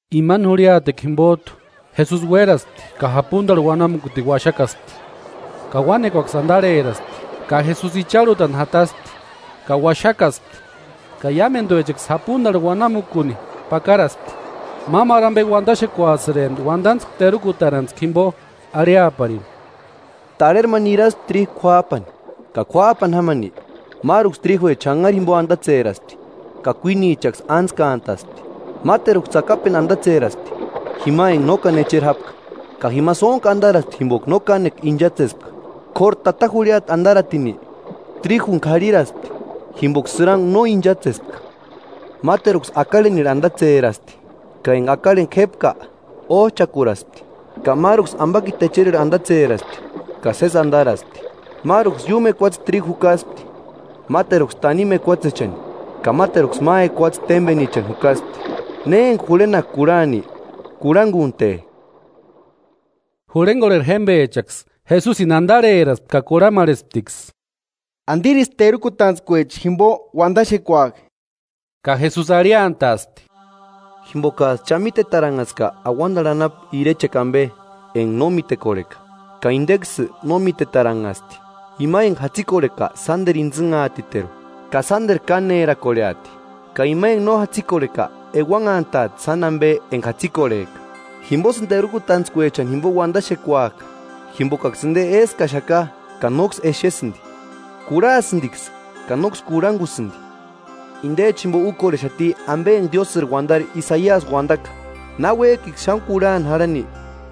Imani jurhiatekua jimpot'u Jesusi uéraspti ka japuntarhu uanamukuni uaxakaspti. Ka uánekuaksï antarheraspti, ka Jesusi icharhutani jataspti ka uaxakaspti, ka iámentuechaksï japuntarhu uanamukuni pakaraspti. Mámaru ampe uantaxekuasïrempti uantantskua terukutarantskua jimpo, arhiaparini: “Tarheri ma niraspti tríju k'uáp'ani. Ka k'uap'ani jámani, máruksï tríjuecha xanhari jimpo antatseraspti ka kuínichaksï ántskantaspti. Máteruksï tsakapentu antatseraspti, jima enka no káni echeri jápka, ka jima sóntku antaraspti jimpoka no kánekua inchatsespka; k'óru tata jurhiata antaratini, tríjuni k'arhiraspti, jimpoka sïrankua no inchatsespka. Máteruksï akarhenirhu antatserasti, ka enka akarheni k'épka óch'akuraaspti. Ka máruksï ampakiti echerirhu antatseraspti, ka sési antaraspti; máruksï iúmu ekuatsechani tríju jukaspti, máteruksï tanimu ekuatsechani, ka máteruksï ma ekuatse témpenichani jukaspti. Ne enka jurhenaka kurhani, kurhankunte.” Jurhenkorheri jémpechaksï Jesusini antarheraspti ka kurhamarhesptiksï: “¿Antirisï terukutantskuecha jimpo uantaxekuak'i?” Ka Jesusi arhiantaaspti: “Jimpokats'ï cha mítetaranhaska auantarhu anapu irechekua ampe enka no mítekorheka, ka inteksï no mítetaranhasti. Ima enka jatsikorheka sánteru intsïnhaatiteru ka sánteru kánerakorheati, ka ima enka no jatsikorheka euanhantaati sáni ampe enka jatsikorheka. Jimposïni terukutantskuechani jimpo uantaxekuak'a, jimpokaksï inte éskaxaka ka nóksï exesïnti, kurhasïntiksï ka nóksï kurhankusïnti. Intecha jimpo úkorhexati ampe enka Diósïri uantari Isaiasi uantaka: ‘Na uék'iksï xáni kurhani jarhani,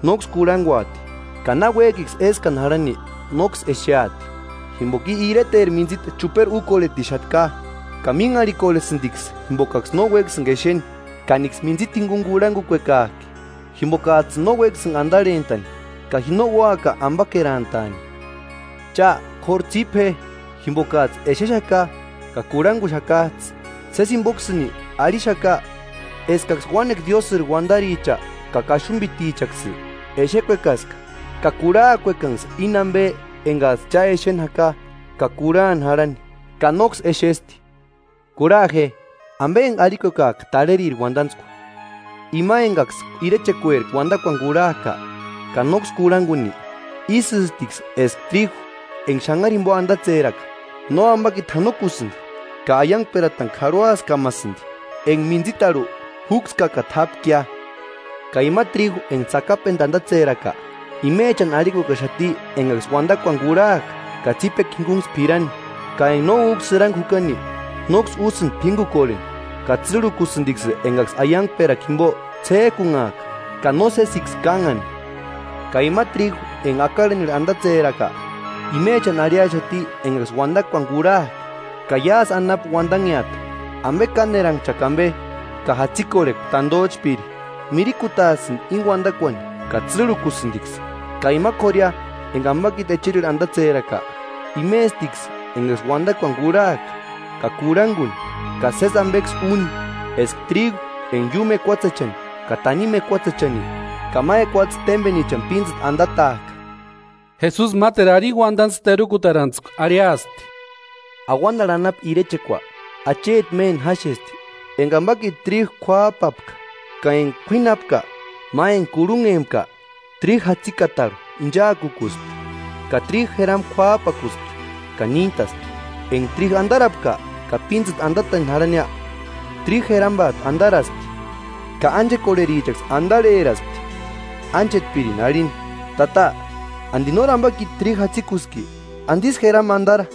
nóksï kurhankuati, ka náuek'iksï éskani jarhani, nóksï exeati. Jimpoka i ireteri mintsita chuperi úkorhetixaka, ka mínharhikorhestiksï jimpokaksï no uékasïnka exeni, ka níksï mintsita jinkuni kurhankukuekak'i, jimpokats'ïni no uékasïnka antarhentaani, ka ji no úaka ampakerantaani.’” “Cha k'óru tsípe je, jimpokats'ï exexaka ka kurhankuxakats'ï. Sési jimpoksïni arhixaka, eskaksï uánekua Diósïri uantaricha ka kaxumpitichaksï, exekuekaska ka kurhaakuekanksï íni ampe enkats'ï cha exeni jaka ka kurhani jarhani, ka nóksï exesti.” “Kurhaa je, ampe enka arhikuekak'a tarheriri uantantskua: Ima enkaksï irechekueri uantakuani kurhak'a, ka nóksï kurhankuni, ísïstiksï eska tríju enka xanhari jimpo antatseraka; nóampakiti janokusïnti ka aiankperatani k'arhuaskamaasïnti enka mintsitarhu júkskakata jápkia. Ka ima tríju enka tsakapentu antatseraka, imechani arhikuekaaxati enkaksï uantakuani kurhak'a ka tsípekua jinkunksï p'irani, ka enka no úka sïrankua jukani, nóksï úsïnti p'ínkukorheni ka tsîrhukusïntiksï enkaksï aiankperakua jimpo ts'ék'unhak'a ka nósesiksï kánhani. Ka ima tríju enka akarhenirhu antatseraka, imechani arhiaxati enkaksï uantakuani kurhak'a, ka iásï anapu uantanheata, ampe káneranhchakua ampe ka jatsikorhekua tantoch'píri, mirikutaasïnti íni uantakuani ka tsîrhukusïntiksï. Ka ima k'óruia enka ampakiti echerirhu antatseraka, imestiksï enkaksï uantakuani kurhak'a ka kurhankuni ka sési ampeksï úni, eska tríju enka iúmu ekuatsechani ka tanimu ekuatsechani ka ma ekuatse témpenichani píntsïta antatak'a.” Jesusi máteru arini uantatskua terukutarantskua arhiaspti: “Auantarhu anapu irechekua, acheti méni jáxesti enka ampakiti tríju k'uáp'apka. Ka enka k'uínhani jápka, ma enka kurhunhempka tríju jatsikatarhu inchaakukuspti, ka tríju jerampa k'uáp'akuspti ka níntaspti. Enka tríju antarapka ka píntsïta antatani jarhania, tríju jerampat'u antaraspti. Ka ánchekorherichaksï antarheraspti ánchetpirini arhini: ‘Tata, ¿Anti nóri ampakiti tríju jatsikuski? ¿Antisï jerampa antara?’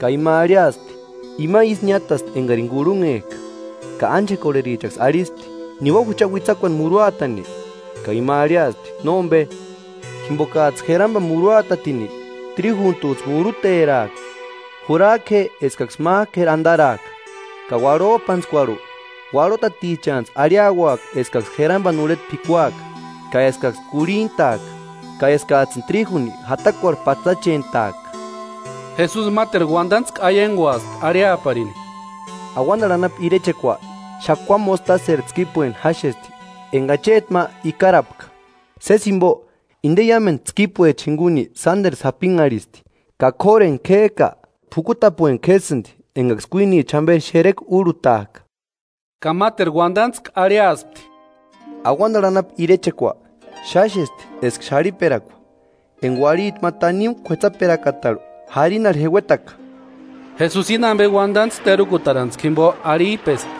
Ka ima arhiaspti: ‘Ima ísï niátasti enkarini kurhunhek'a,’ ka ánchekorherichaksï arhispti: ‘¿Niua jucha uitsakuani muruatani?’ Ka ima arhiaspti: ‘Nómpe, jimpokats'ï jerampani muruatatini tríjuntuts'ï muruteraaka. Jurak'u je eskaksï mák'u k'éri antaraaka, ka uarhop'antskuarhu, uarhoatatichani arhiauaka eskaksï jerampani urheta p'ikuaka, ka eskaksï kurhint'aaka; ka eskats'ïni tríjuni jatakuarhu patsachent'aaka.’” Jesusi máteru uantantskua aiankuaspti arhiaparini: “Auantarhu anapu irechekua xakua mostaseri tskípueni jáxesti, enka acheti ma ikarapka. Sési jimpo, inte iámentu tskípuecha jinkuni sánteru sapinharhisti, ka k'óru enka k'ék'a, p'ukutapueni k'ésïnti enkaksï kuínicha jamperi xerekua úrhutak'a.” Ka máteru uantatskua arhiaspti: “Auantarhu anapu irechekua, xáxesti eska xarhiperakua, enka uarhiti ma tanimu k'uetsaperakata jarinarhu jeuetaka.” Jesusi íni ampe uantantskua terukutarantskua jimpo arhip'esti,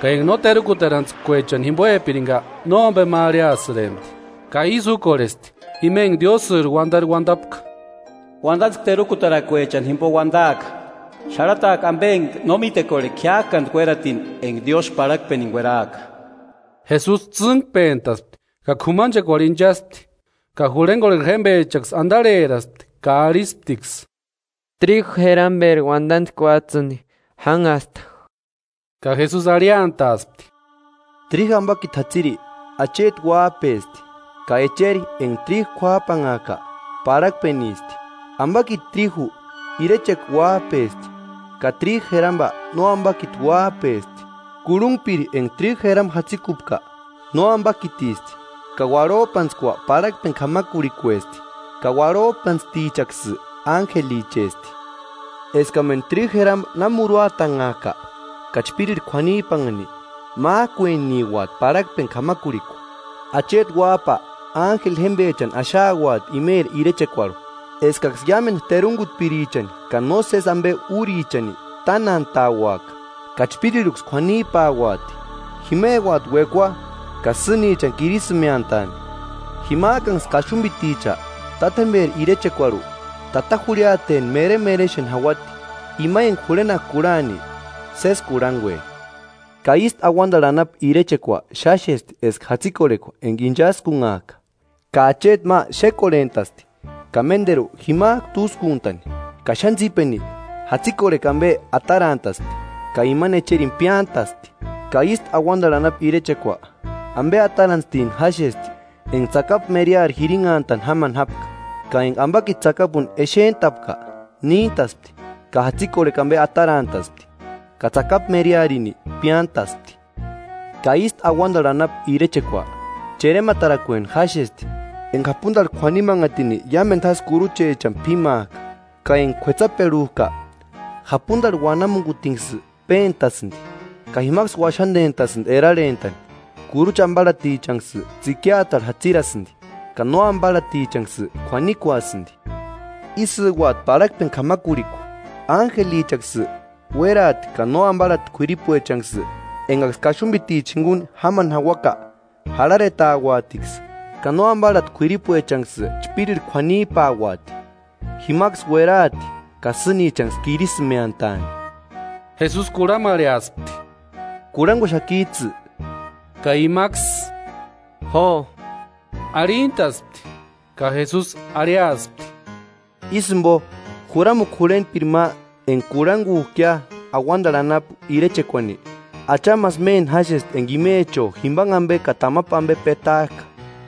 ka enka no terukutarantskuechani jimpoepirinka nómpema arhiasïrempti. Ka ísï úkorhesti ima enka Diósïri uantari uantapka: “Uantatskua terukutarakuechani jimpo uantaaka; xarhataaka ampe enka no mítekorheka jiák'antki uératini enka Diósï parhakpeni kueraaka.” Jesusi tsînkpentaspti ka k'umanchekuarhu inchaspti. Ka jurhenkorheri jémpechaksï antarheraspti ka arhisptiksï: “Tríju jeramperi uantatskuats'ïni jánhasta.” Ka Jesusi arhiantaaspti: “Tríju ampakiti jatsiri, Acheti Uáp'esti. Ka echeri enka tríju k'uáp'anhak'a, parhakpenisti; ampakiti tríju, irechekua uáp'esti, ka tríju jerampa nóampakiti uáp'esti. Kurhunhpiri enka tríju jerampa jatsikupka, nóampakitisti, ka uarhop'antskua parhakpeni k'amakurhikuesti, ka uarhop'antstichaksï ánjelichesti. Eskamentu tríju jerampa na muruatanhak'a ka chpírirhu k'uanip'anhani, mák'ueniuati parhakpeni k'amakurhikua. Acheti Uáp'a ánjeli jémpechani axauati imeri irechekuarhu, eskaksï iámentu terunkutpirichani ka nósesi ampe úrichani tánantauaka, ka chpírirhuksï k'uanip'auati; jimeuati uekua ka sînichani kirisïmeantaani. Jimak'anksï kaxumpiticha Tátjemperi irechekuarhu, tata jurhiateni meremerexeni jauati. Ima enka jurhenaka kurhani, sési kurhankue.” “Ka ístu auantarhu anapu irechekua xáxesti eska jatsikorhekua enka inchaskunhak'a. Ka acheti ma xékorhent'asti ka ménteru jimak'u túskuntani, ka xáni tsípeni, jatsikorhekua ampe atarantasti ka imani echerini piántasti.” “Ka ístu auantarhu anapu irechekua, ampe atarantstini jáxesti enka tsakapu meriari jirinhantani jámani jápka, ka enka ampakiti tsakapuni exent'apka, níntaspti ka jatsikorhekua ampe atarant'aspti ka tsakapu merearini piántaspti.” “Ka ístu auantarhu anapu irechekua, cherematarakueni jáxesti enka japuntarhu k'uanimanhatini iámentu jásï kuruchechani p'ímak'a. Ka enka kuetsaperhuk'a, japuntarhu uanamukutinksï péntasïnti ka jimaksï uaxantentasïnti erarhentani, kurucha amparhatichanksï tsïkiatarhu jatsirasïnti, ka nóamparhatichanksï kuanikuasïnti. Ísïuati parhakpeni k'amakurhikua: Ánjelichaksï uéraati ka no amparhati k'uripuechanksï, enkaksï kaxumpiticha jinkuni jámani jauaka, jarharetauatiksï, ka nóamparhati k'uripuechanksï chpírirhu k'uanip'auati. Jimaksïsï ueraati ka sînichani kirisïmeantaani.” Jesusi kurhamarheaspti: “¿Kurhankuxakits'ï?” Ka imaksï: “Jo” Arhintaspti. Ka Jesusi arhiaspti: “Ísï jimpo juramukua jurhentpiri ma enka kurhankuk'ia auantarhu anapu irechekuani, achamasï méni jáxesti enka imecho jimpanhe ampe ka tamapu ampe petak'a.”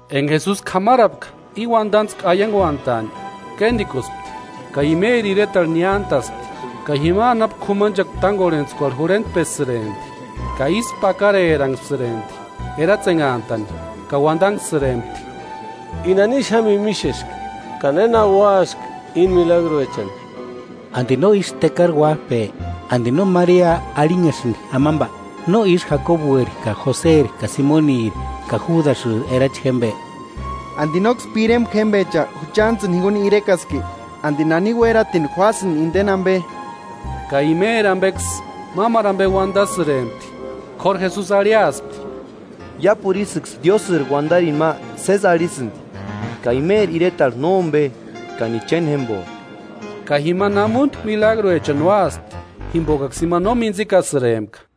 Enka Jesusi k'amarapka íni uantantskua aiankunt'aani, kéntikuspti. Ka imeri iretarhu niántaspti, ka jima anapu k'umanchekua tánkorhentskuarhu jurhentpesïrempti, ka ísku pakareranhasïrempti eratsenhantani ka uantanhsïrempti: “¿I nani xáni mímixeski, ka néna úasïnki íni milagruechani? ¿Anti no ísï tekari uáp'e? ¿Anti no Maria arhinhasïnki amampa? ¿No ísï Jakobueri ka Joseri ka Simoniri ka Júdasïri erachi jémpe? ¿Anti nóksï pirempa jémpecha juchantsïni jinkuni irekaski? ¿Anti nani uératini juásïnki inteni ampe?” Ka imeri ampeksï mámaru ampe uantasïrempti. K'óru Jesusi arhiaspti: “Iápuru ísïksï Diósïri uantarini ma sési arhisïnti, ka imeri iretarhu nómpe ka ni chéni jémpo.” Ka jima namuntku milagruechani úaspti jimpokaksï imani no mintsikasïrempka.